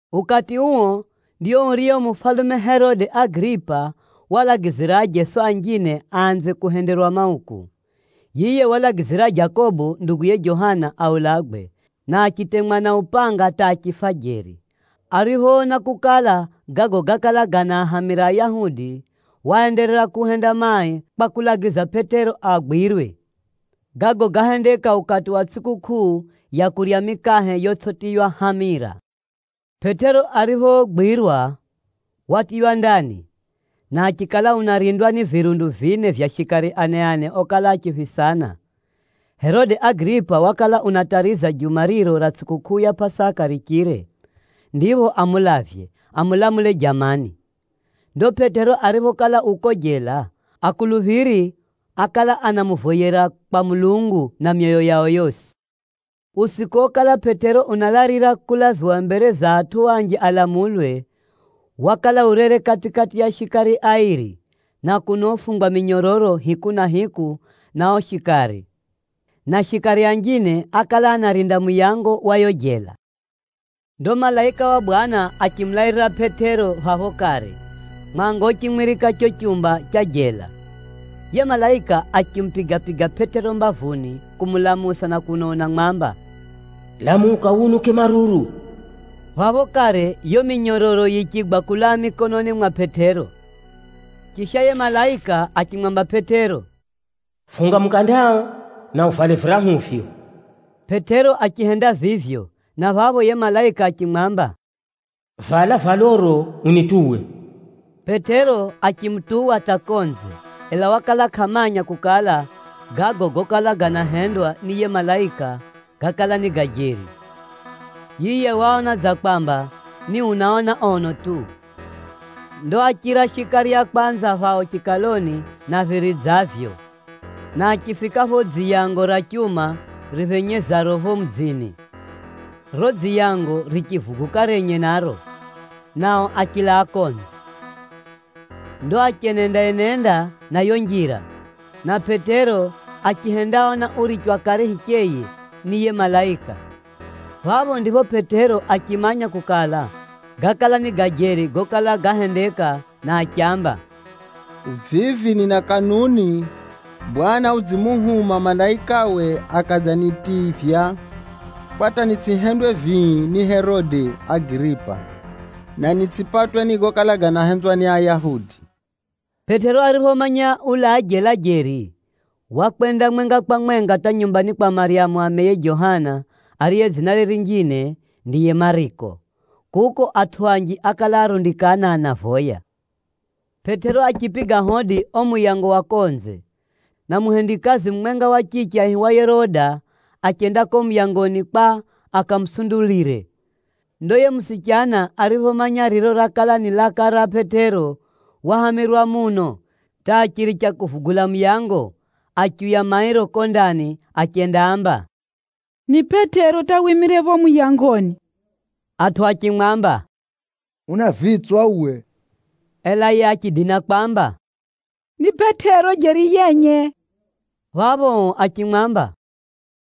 Ukati uo, ndio urio mufalume Herode Agiripa walagizira ajeso anjine aanze kuhenderwa mauku. Yiye walagizira Jakobo nduguye Johana aulagwe, na achitemwa na upanga hata achifa jeri. Ariphoona kukala, gago gákala ganaahamira Ayahudi, waenderera kuhenda mai kwa kulagiza Pʼetero agwirwe. (Gago gáhendeka ukati wa tsʼikukʼuu ya kurya mikahe yotsʼitiywa hamira.) Pʼetero ariphogwirwa, watiywa ndani, na achikala unarindwa ni virundu vine vya shikari ane-ane okala achiphisana. Herode Agiripa wakala unatariza juma riro ra tsʼikukʼuu ya Pʼasaka richire, ndipho amulavye, amulamule jamani. Ndo Pʼetero ariphokala u ko jela, akuluphiri ákala anamuvoyera kwa Mulungu na myoyo yao yosi. Usiku okala Pʼetero unalalira kulaviwa mbere za atʼu anji alamulwe, wakala urere kati-kati ya shikari airi, na kuno ufungwa minyororo hiku na hiku na o shikari. Na shikari anjine, ákala anarinda muyango wa yo jela. Ndo malaika wa Bwana achimulairira Pʼetero phapho kare, mwanga uchimwirika cho chumba cha jela. Yiye malaika achimupiga-piga Pʼetero mbavuni kumulamusa na kuno unamwamba, “Lamuka wunuke maruru!” Phapho kare yo minyororo yichigwa kulaa mikononi mwa Pʼetero. Chisha, yiye malaika achimwamba Pʼetero, “Funga mukandao, na uvale virahuvyo.” Pʼetero achihenda vivyo, na phapho yiye malaika achimwamba, “Vala valoro unituwe.” Pʼetero achimutuwa hata konze, ela wakala kʼamanya kukala, gago gokala ganahendwa ni yiye malaika, gákala ni ga jeri. Yiye waona dza kwamba, ni unaona ono tu. Ndo áchira shikari a kwanza phao chikaloni na phiri dza vivyo, na achifika pho dziyango ra chuma riphenyezaro pho mudzini. Riro dziyango richivuguka renye naro, nao achilaa konze. Ndo achenenda-enenda na yo njira, na Pʼetero achihendaona urichwa kare hicheye ni yiye malaika. Phapho ndipho Pʼetero achimanya kukala, gákala ni ga jeri gokala gahendeka na achiamba, “Vivi nina kanuni Bwana udzimuhuma malaikawe akadzanitivya kwa hata nitsʼihendwe vii ni Herode Agiripa, na nitsʼipatwe ni gokala ganahenzwa ni Ayahudi.” Pʼetero ariphomanya ulaa jela jeri, wakwenda mwenga kwa mwenga hata nyumbani kwa Maryamu ameye Johana, ariye dzinare rinjine ndiye Mariko. Kuko, atʼu anji ákala arundikana anavoya. Pʼetero achipiga hodi o muyango wa konze, na muhendikazi mumwenga wa chiche aihiwaye Roda, achenda ko muyangoni kwa akamusundulire. Ndo yiye musichana ariphomanya riro rakala ni laka ra Pʼetero, wahamirwa muno hata achiricha kuvugula muyango, achiuya mairo ko ndani achendaamba, “Ni Pʼetero hata wimire pho muyangoni.” Atʼu achimwamba, “Una vitswa uwe!” Ela yiye achidina kwamba, “Ni Pʼetero jeri yenye!” Phapho o achimwamba,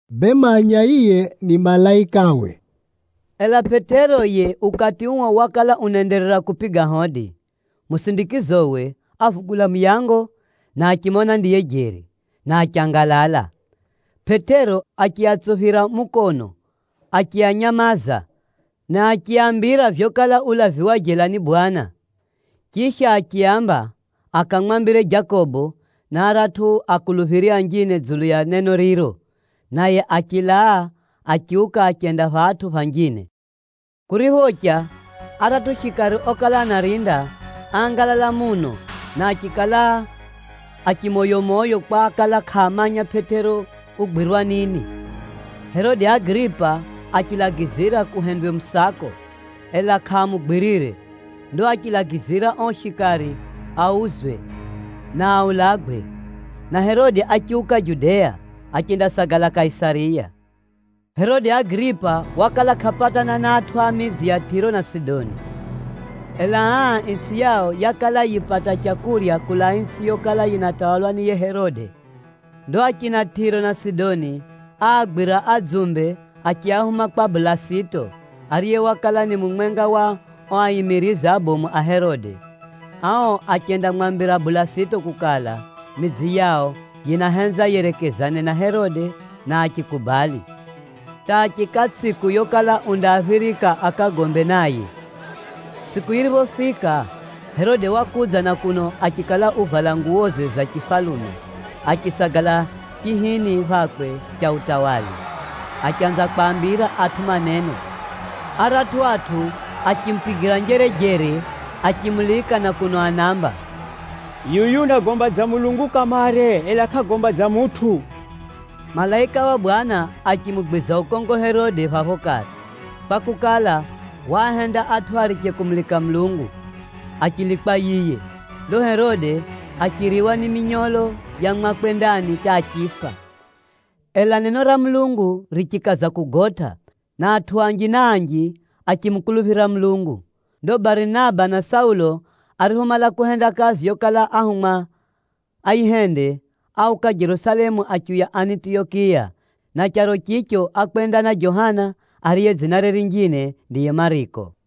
“Bee manya yiye ni malaikawe.” Ela Pʼetero yiye ukati uo wakala unaenderera kupiga hodi. Musindikizowe, ávugula muyango na achimona ndiye jeri, na achangalala. Pʼetero achiatsuphira mukono achianyamaza, na achiaambira vyokala ulaviwa jela ni Bwana. Chisha, achiaamba akamwambire Jakobo, na aratʼu akuluphiri anjine dzulu ya neno riro, naye achilaa achiuka achenda phatʼu phanjine. Kuriphocha, aratʼu shikari okala anarinda, áangalala muno na achikala a chimoyomoyo kwa ákala kʼaamanya Pʼetero ugwirwa nini. Herode Agiripa achilagizira kuhendwe musako, ela kʼaamugwirire. Ndo achilagizira o shikari auzwe, na aulagwe. Na Herode achiuka Judea, achendasagala Kaisariya. Herode Agiripa wakala kʼapatana na atʼu a midzi ya Tʼiro na Sidoni. Ela aa, itsʼi yao yakala yipata leu kulaa itsʼi yokala yinatawalwa ni yiye mufalume Herode. Ndo achina Tʼiro na Sidoni áagwira adzumbe achiahuma kwa Bulasito, ariye wakala ni mumwenga wa o aimirizi abomu a Herode. Ao achendamwambira Bulasito kukala, midzi yao yinahenza yerekezane na Herode, na achikubali hata achiika tsʼiku yokala undaaphirika akagombe naye. Tsʼiku yiriphofika, Herode wakudza na kuno achikala uvala nguwoze za chifalume, achisagala chihini phakwe cha utawala, achanza kwaambira atʼu maneno. Aratʼu atʼu achimupigira njerejere achimulika na kuno anaamba, “Yuyu unagomba dza mulungu kamare, ela kʼagomba dza mutʼu!” Malaika wa Bwana achimugwiza ukongo Herode phapho kare, kwakukala, waahenda atʼu ariche kumulika Mulungu, achilikwa yiye. Ndo Herode achiriwa ni minyolo ya mwakwe ndani hata achifa. Ela neno ra Mulungu richikaza kugotʼa, na atʼu anji na anji, achimukuluphira Mulungu. Ndo Barinaba na Saulo ariphomala kuhenda kazi yokala ahumwa ayihende, áuka Jerusalemu achiuya Anitiyokiya, na charo chicho ákwenda na Johana, ariye dzinare rinjine ndiye Mariko.